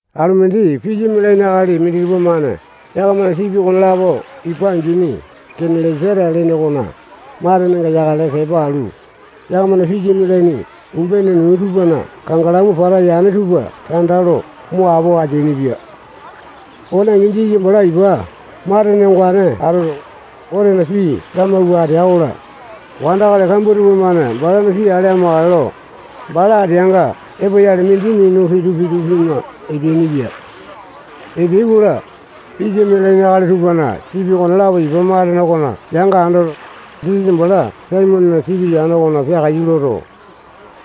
Alumindi pisa mialaini akali minditupa-mane yakamana sipi okonelapo ipa angini Genesa-leta lene okona matenenga yakale tepa alu, yakamana pisa mialaini umbene nuu tupana kangalamu pata yane tupa tanda lo mo apo ateainipia. Okone angi, Jisasa bala ipa matene ongane atoto, Gotena pii lamawua atea-kola, wandakali kambua tupamane balana pii ale amakale lo, bala ateanga epoyale, mindi minu pitu-pitu pima epeainipia. Epeai-kola, pisa mialaini akali tupana sipi okonelapo ipa matene okona yanga andoto, Jisasa bala Saimonena sipi yane okona peakaiyu loto,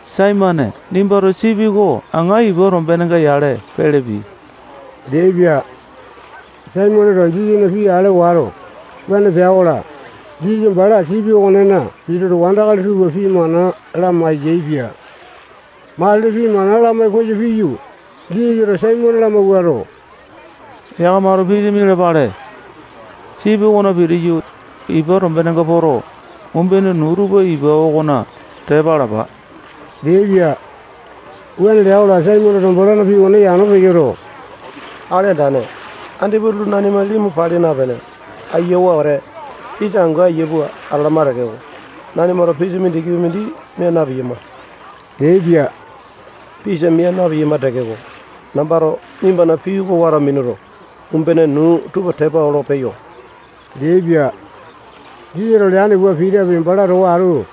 Saimone, nimbato sipi oko aŋa ipa tombeka-yale pele pii leaipia. Saimoneto Jisasana pii ale wato, wuane pea-kola, Jisasa bala sipi okonena pituto, wandakali tupa pii mana lamai-yaepia. Matili pii mana lamai koyo piyu, Jisasato Saimone lamawuato, yakamato pisa mialapale. Sipi okona pitiyu, ipa tombeka poto, umbene nuu tupa ipa okona tepa alapa leaipia. Wuane lea-kola, Saimoneto balana pii okone yano peyoto, Akali Andane, andipa utulu nanima limu pali napene, ayiawa wete, pisa angu ayia pua atalama tekeko, nanimato pisa mindikipi mindi mia na-piyama leaipia. Pisa mia piyama tekeko, nambato nimbana pii oko wato minuto, umbene nuu tupa tepa olo peyo leaipia. Jisasato leane pua Pitapi, bala towa atu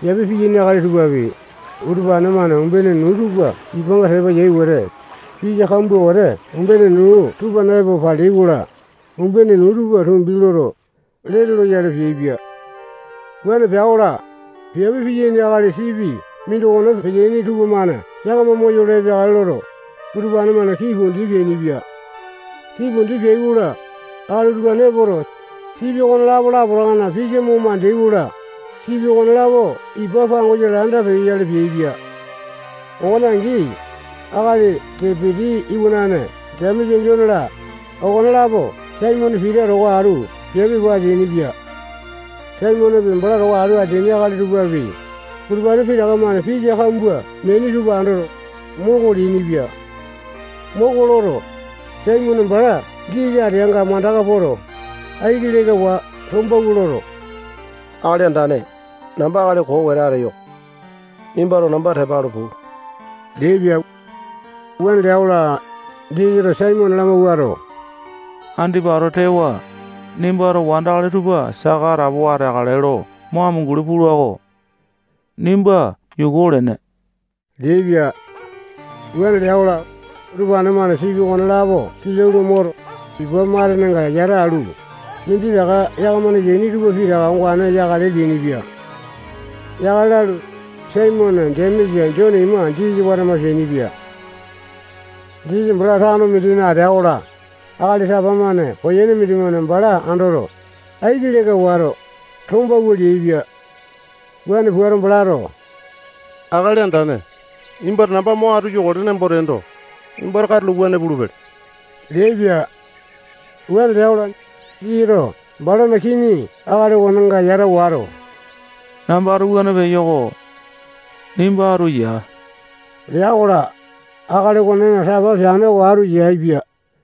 peape peaini akali tupapi, utupane-mane umbene nuu tupa ipanga tepa yai wete, pisa kambua wete umbene nuu tupana epo paleai-kola, umbene nuu tupa tumbi loto, lete loyale peaipia. Wuane pea-kola, piape piyaini akali sipi mindokona peteaini tupamane yakama moyolo epeakale loto, utupane-mane kii pundi peainipia. Kii pundi peai-kola, akali utupane epoto, sipi okonelapo lapotakana pisa mo mandeai-kola, sipi okonelapo ipa pangosa landa peyoyale peaipia. Okone angi, akali Sepiti iwanane Jemesa, Jone-la, okonelapo Saimone Pita towa atu piape pua ateainipia. Saimonepi, bala towa atu ateaini akali tupapi, utupane pitaka-mane pisa kambua meaini tupa andoto, moko leainipia. Moko loto, Saimone bala Jisasa ateanga mandaka poto, aiki lekawa tombawua loto, Akali Andane, namba akali koo wete ateyo-ko. Nimbato namba tepa alu puu leaipia. Wuane lea-kola, Jisasato Saimone lamawuato, andipa ato tewa, nimbato wandakali tupa saka atapowa ateakale lo mo amunguli pula-ko. Nimba yuku olene leaipia. Wuane lea-kola, utupane-mane sipi okonelapo kilau lo moto, ipa matenenga yata alu, minditaka yakamana yaini tupa pitaka ongane yakale leainipia. Yakale lalu, Saimone, Jemesa, Jone ima, Jisasa watama peainipia. Jisasa bala tano mindina atea-kola, akali tapa-mane koyene mindimane bala andoto, aiki leka wato, tombawua leaipia. Wuane puato, balato Akali Andane, nimbato namba mo atu yokale nembo teendo, nimbato katulo wuane pulupele leaipia. Wuane lea-kola, Jisasato balana kini akali okonenga yata wato, nambato wuane peyo-ko. Nimba atu yaa lea-kola, akali okonena tapa peane oko atu yaepia.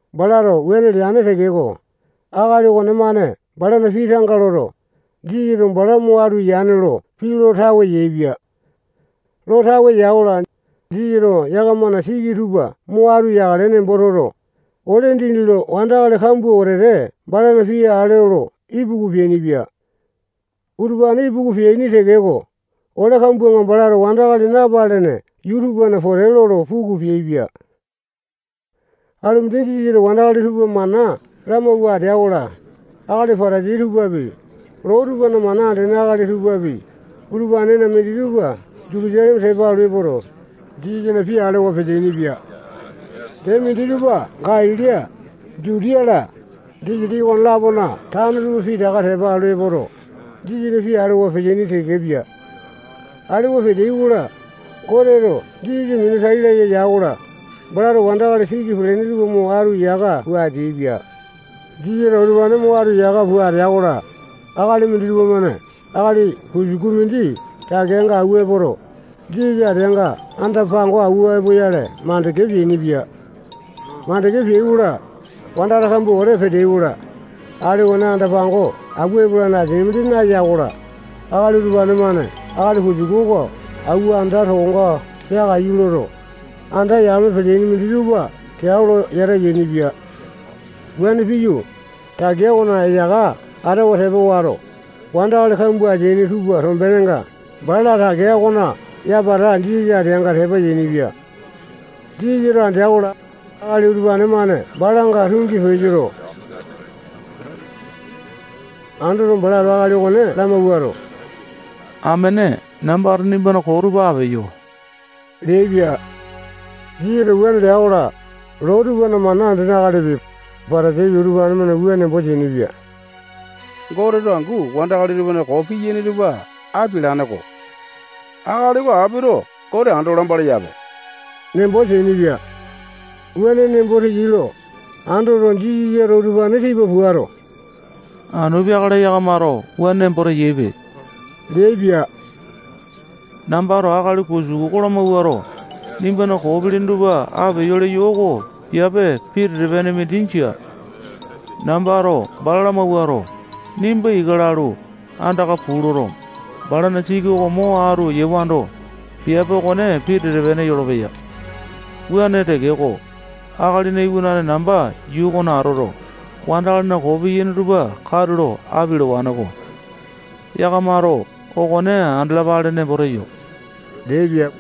Balato wuane leane tekeko, akali okonemane balana pii tanga loto, Jisasato bala mo atu yane lo pii lo tawe yaepia. Lo tawe ya-kola, Jisasato yakamana siki tupa mo atu yakale nembo toto, ole dindi lo wandakali kambua wetete balana pii ale olo ipuku peainipia. Utupane ipuku peaini tekeko, ole kambuanga balato wandakali napalene yuu tupana pote lolo puku peaipia. Alumindi Jisasato wandakali tupa mana lamawua atea-kola, akali Patasai tupapi, loo tupana mana andene akali tupapi, utupanena minditupa Jutusaleme tepa alu epoto, Jisasana pii alewa peteaini-pia. Dee, minditupa Galili, Jutiya-la, disitiki okone-lapona tano tupa pitaka tepa alu epoto, Jisasana pii alewa peteaini tekepia. Alewa peteai-kola, Goteto Jisasa minu tai laya ya-kola, balato wandakali siki pelene tupa mo atu yaka pua ateaipia. Jisasato utupane mo atu yaka pua atea-kola, akali minditupa-mane akali kusuku mindi takeanga awua epoto, Jisasa ateanga anda-pango awua epoyale makande peainipia. Makande peai-kola, wandakali kambua wete peteai-kola, akali okone anda-pango awua epolane asia mindi naya-kola, akali utupane-mane akali kusuku oko awua anda tokonga peakaiyu loto, anda yame pelene minditupa keao lo yata yainipia. Wuane piyu, takea okona eyaka atawa tepa wato, wandakali kambua ateaini tupa tombenenga bala takea okona yapata Jisasa ateanga tepa yainipia. Jisasato andea-kola, akali utupane-mane balanga tungi peyoto, wuane peyai lo andeaipia. Andoto, balato akali okone lamawuato, amene, nambato nimbana koo tupa apeyo leaipia. Jisasato wuane lea-kola, loo tupana mana andene akalipi, Patasaipi, utupane-mane wua nembo teainipia: Goteto angu wandakali tupana koo piyaini tupa apialane-ko. Akali oko apito Gote ando lamba leyape nembo teainipia. Wuane nembo teyai lo andoto, Jisasato utupane tipa puato, anu peakale yakamato wuane nembo teyaipe leaipia. Nambato akali kusuku oko lamawuato, nimbana koo pilini tupa apeyo leyo oko piape pitete-pene mindi jia. Nambato bala lamawuato, nimba ika lalu, andaka puu loto, balana siki oko mo atu yewando, piape okone pitete-pene yolopeya. Wuane tekeko, Akalina Iwanane namba yuu okona atoto, wandakalina koo piyaini tupa katulo apialawane-ko. Yakamato okone andalapale nembo teyo leaipia.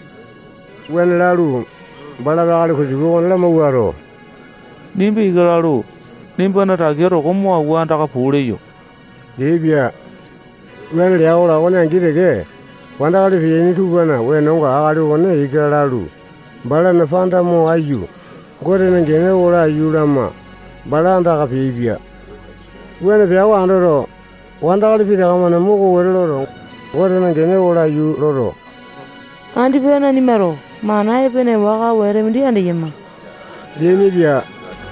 Wuane lalu, balato akali kusuku okone lamawuato, nimba ika lalu, nimbana takea toko mo awua andaka puu leyo leaipia. Wuane lea-kola, okone angi teke, wandakali peteaini tupana wenonga akali okone ika lalu, balana panda mo aiyu, Gotena gene oko laiyu lama, bala andaka peaipia. Wuane pea oko andoto, wandakali pitaka-mane moko wete loto, Gotena gene oko laiyu loto, andipa nanimato mana epene waka wete mindi andeyama leainipia.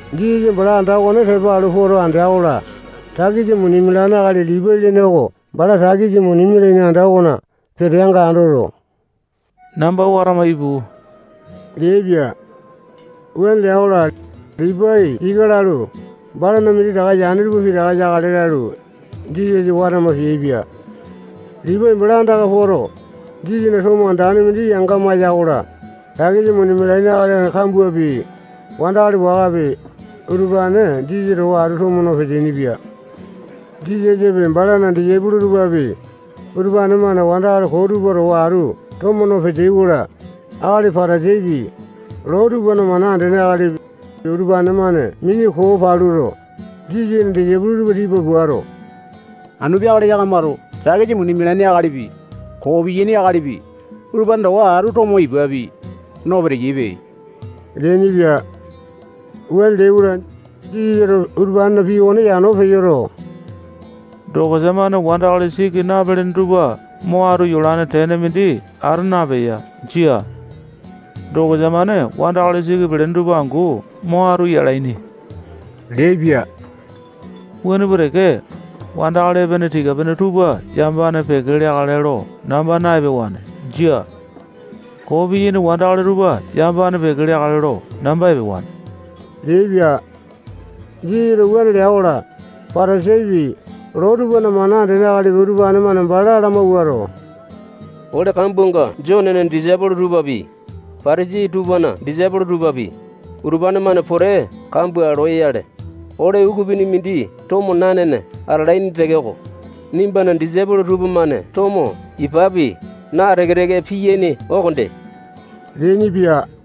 Jisasa bala anda okone tepa alu poto andea-kola, takisa muni mialane akali Lipai lene oko bala takesa muni mialaini anda okona peteanga andoto, namba watama ipu leaipia. Wuane lea-kola, Lipai ika lalu, balana minditaka yane tupa pitaka yakale lalu, Jisasa watama peaipia. Lipai bala andaka poto, Jisasana tomo andane mindi yanga maya-kola, takisa muni mialaini akali kambuapi, wandakali wakapi, utupane Jisasa towa atu tomo no peteaini-pia. Jisasapi, balana disaipolo tupapi, utupane-mane wandakali koo tupa towa atu tomo no peteai-kola, akali Patasaipi, loo tupana mana andene akalipi, utupane-mane mini koo paluto, Jisasana disaipolo tupa tipa puato, anu peakale yakamato takisa muni mialaini akalipi, koo piyaini akalipi, utupane towa atu tomo ipapi, no peteyaipe leainipia. Wuane leai-kola, Jisasato utupanena pii okone yano peyoto, dokosa-mane wandakali siki napalene tupa mo atu yolane tene mindi ata napeya. Jia. Dokosa-mane wandakali siki pelene tupa angu mo atu yalaini leaipia. Wuane pua teke, wandakali epene tika-pene tupa yamapane peke leakale lo namba na-epewane. Jia. Koo piyaini wandakali tupa yamapane peke leakale lo namba epewane leaipia. Jisasato wuane lea-kola, Patasaipi, loo tupana mana andene akalipi, utupane-mane bala lamawuato, ole kambuanga Jonena disaipolo tupapi, Patasai tupana disaipolo tupapi, utupane-mane pote kambua loyale, ole ukupini mindi tomo nanene atalaini tekeko, nimbana disaipolo tupamane tomo ipapi naa teke-teke piyaini okonde leainipia.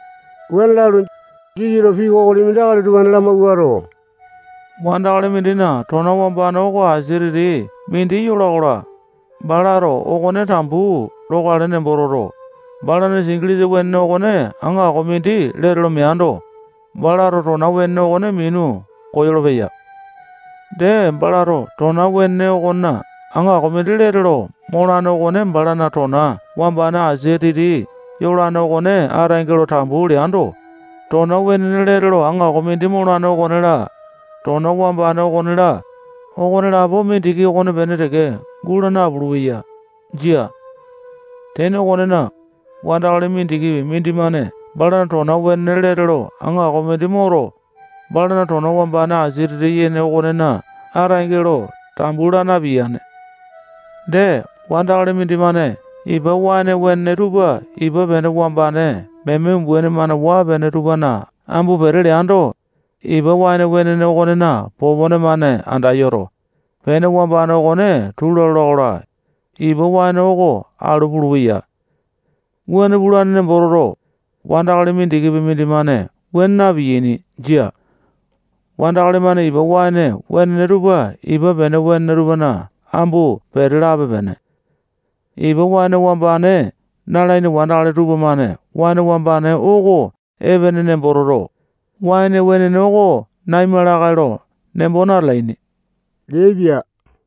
Wuane lalu, Jisasato pii kokoli mindi akali utupane lamawuato, wandakali mindina tona wambane okona asia titi mindi yola-kola, balato okone tambu lokale nembo toto, balana singilisa wenene okona aŋako mindi lete lo meando, balato tona wenene okone minu koyolo-peya. Dee, balato tona wenene okona aŋako mindi lete lo molane okone balana tona wambane asia titi yolane okone ataenge lo tambu leando, tona wenene lete lo aŋako mindi molane okone-la, tona wambane okone-la, okonelapo mindiki okonepene teke guu nalolo-peya. Jia. Tene okonena, wandakali mindikipi mindimane balana tona wenene lete lo aŋako mindi moto, balana tona wambane asia titi yene okonena ataenge lo tambu laa napiyane. Dee, wandakali mindimane ipa waene wenene tupa ipa pene wambane meme umbaini-mane waa-pene tupana ambu pete leando, ipa waene wenene okonena popone-mane anda yoto, pene wambane okone tula lola-kola, ipa waene oko alu pulupeya. Wuane pulane nembo toto, wandakali mindikipi mindimane wuane napiyane. Jia. Wandakali-mane ipa waene wenene tupa ipa pene wenene tupana ambu pete lape-pene. Ipa waene wambane nalaini wandakali tupamane waene wambane oko epene nembo toto, waene wenene oko naima lakae lo nembo natalaini leaipia.